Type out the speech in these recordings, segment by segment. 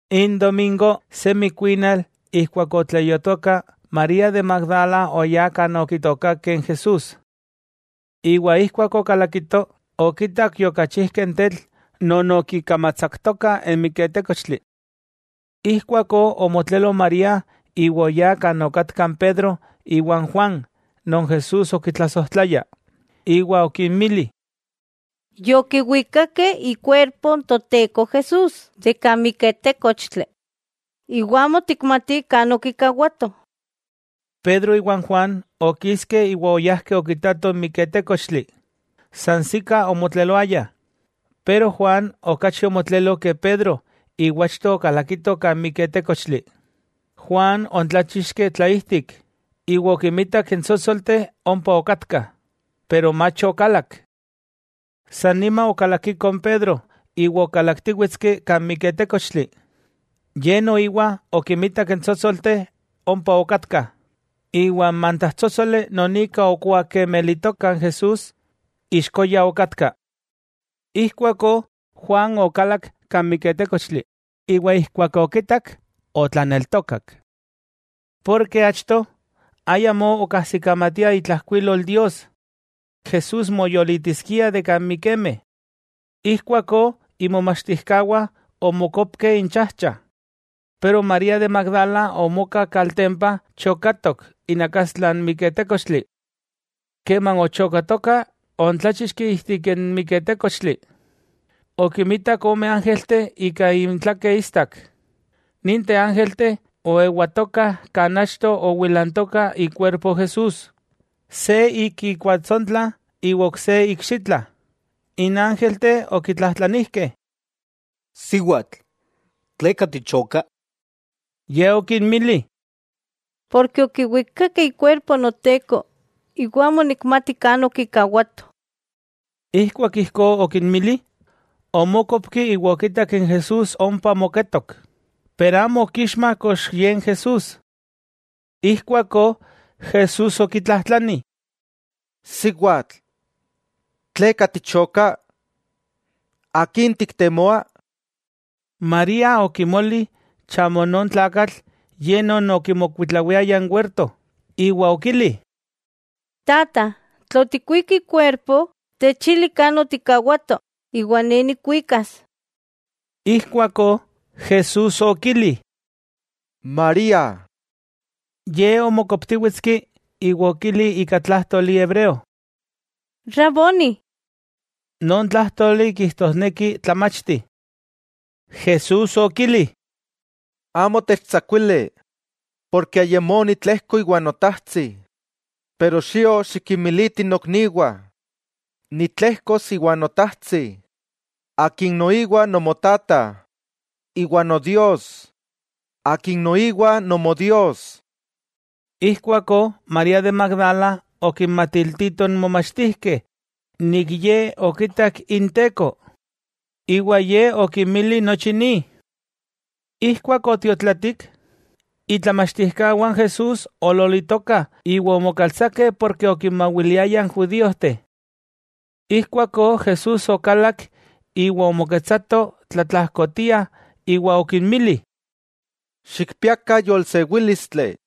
N domingo, semi kuinal ijkuak ok otleyuatoka, María de Magdala oyá kan okitookakeh n Jesús. Iwa ijkuak okalakito, okitak yokachijkeh n tetl non okikamatsaktoka n miketékochtli. Ijkuakó omotlelo María iwa oyá kan okatka n Pedro iwa n Juan non Jesús okitlasojtlaya, iwa okinmili: —Yokiwikakeh ikuerpo n Toteko Jesús de kan miketékochtli, iwa amo tikmatih kan okikawatoh. Pedro iwa Juan okiskeh iwa oyajkeh okitatoh n miketékochtli. Sansikah omotleloayah, pero Juan okachi omotlelo ke Pedro iwa achto okalakito kan miketékochtli. Juan oontláchixki tlaijtik, iwa okimitak n tsótsolteh ompa okatkah, pero mach okalak. San nima okalakiko n Pedro iwa okalaktíwetski kan miketékochtli. Ye noiwa okimitak n tsótsolteh ompa okatkah, iwa n mantajtsótsoli non ika okuakemelitoka n Jesús, ixkoya okatka. Ijkuakó Juan okalak kan miketékochtli, iwa ijkuak okitak, otlaneltokak. Porke achto, ayamó okajsikamatiah itlajkuilol Dios, Jesús moyolitiskia de kan mikemeh. Ijkuakó imomachtijkawah omokopkeh inchajcha. Pero María de Magdala omoka kaltempa chokatok inakastla n miketékochtli. Keman ochokatoka oontláchixki ijtik n miketékochtli, okimitak ome ángelteh ika intlakeh istak, ninteh ángelteh oewatokah kan achto owilantoka ikuerpo Jesús, se ik ikuatsontla iwa ok se ikxitla. N ángelteh okitlajtlanijkeh: —Siwatl, ¿tleka tichoka? Ye okinmili: —Porke okiwikakeh ikuerpo Noteko iwa amo nikmati kan okikawatoh. Ijkuak ijkó okinmili, omókopki iwa okitak n Jesús ompa moketok, pero amo okixma kox ye n Jesús. Ijkuakó Jesús okitlajtlani: —Siwatl, ¿tleka tichoka? ¿Akin tiktemoa? María okimoli chamo non tlakatl ye non okimokuitlawiaya n werto, iwa okili: —Tata, tla otikwik ikuerpo, techili kan otikkawato, iwa ne nikwikas. Ijkuakó Jesús okili: —¡María! Ye omokoptíwetski iwa okili ika tlájtoli hebreo: —¡Raboni! —non tlájtoli kijtosneki Tlamachti. Jesús okili: —¡Amo techtsakuili!, porke ayamó nitlejko íwa Notajtsi. Pero xio xikinmiliti nokniwah nitlejkos íwa Notajtsi, Akin noiwa Nomotata, íwa Nodios, akin noiwa Nomodios. Ijkuakó María de Magdala okinmatiltito n momachtijkeh nik ye okitak Inteko, iwa Ye okinmili nochi ni. Ijkuak otiotlatik, itlamachtijkawah n Jesús oololitokah iwa omokaltsakeh porke okinmawiliayah n judíojteh. Ijkuakó Jesús okalak iwa omoketsato tlatlajkotia iwa okinmili: —¡Xikpiakah yolsewílistli!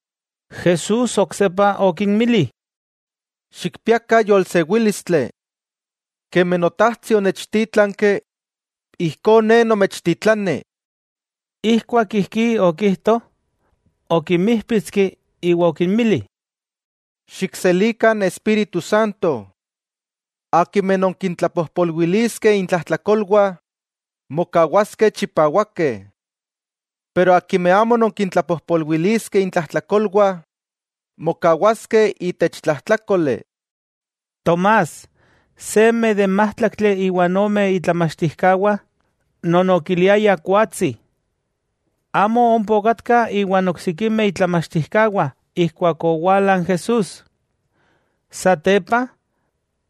Jesús oksepa okinmili: —¡Xikpiakah yolsewílistli! Kemi Notajtsi onechtítlanki, ijkó Ne nomechtitlani. Ijkuak ijkí okijto, okinmíjpitski iwa okinmili: —Xikselikah n Espíritu Santo. Akimeh nonkintlapojpolwiliskeh intlajtlakolwah, mokawaskeh chipawakeh. Pero akimeh amo nonkintlapojpolwiliskeh intlajtlakolwah, mokawaskeh itech tlajtlákoli. Tomás, seme de n májtlaktli iwa ome itlamachtijkawah, non okiliayah kuatsi, amo ompa okatka iwan oksikimeh itlamachtijkawah ijkuak owala n Jesús. Satepa,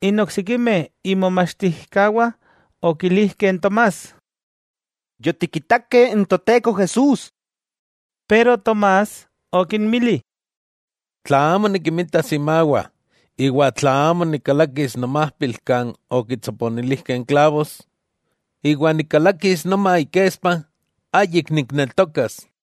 n oksikimeh imomachtijkawah okilijkeh n Tomás: —Yotikitakeh n Toteko Jesús. Pero Tomás okinmili: —Tla amo nikimitas imawah iwa tla amo nikkalakis nomajpil kan okintsoponilijkeh n klavos, iwa nikkalakis noma ikespa, ayik nikneltokas.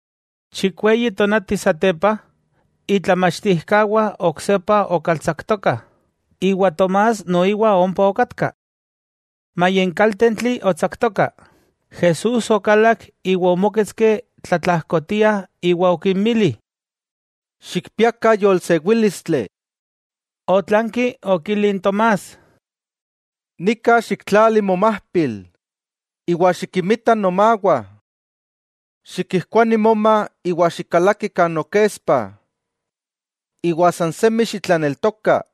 Chikweyi tonati satepa, itlamachtijkawah oksepa okaltsaktokah, iwa Tomás noiwa ompa okatka. Maya n kaltentli otsaktoka, Jesús okalak iwa omóketski tlatlajkotia iwa okinmili: —¡Xikpiakah yolsewílistli! Otlanki okili n Tomás: —Nika xiktlali momajpil, iwa xikinmita nomawah. Xikijkuani moma iwa xikkalaki kan nokespa. Iwa sansemi xitlaneltoka.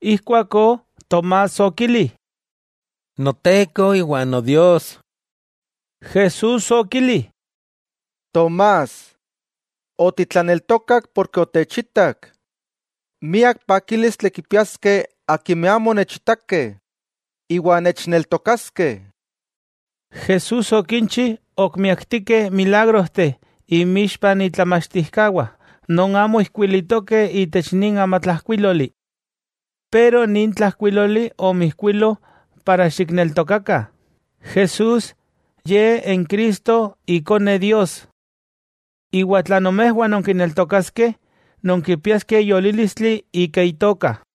Ijkuakó Tomás okili: —¡Noteko iwa Nodios! Jesús okili: —Tomás, otitlaneltokak porke otechitak. ¡Miak pakílistli kipiaskeh akimeh amo onechitakeh, iwa nechneltokaskeh! Jesús okinchi ok miaktikeh milagrojteh inmixpah itlamachtijkawah non amo ijkuilitokeh itech nin amatlajkuíloli. Pero nin tlajkuíloli omoijkuilo para xikneltokakah Jesús Ye n Cristo Ikone Dios. Iwa tla nomejwah nonkineltokaskeh, nonkipiaskeh yolílistli ika Itoka.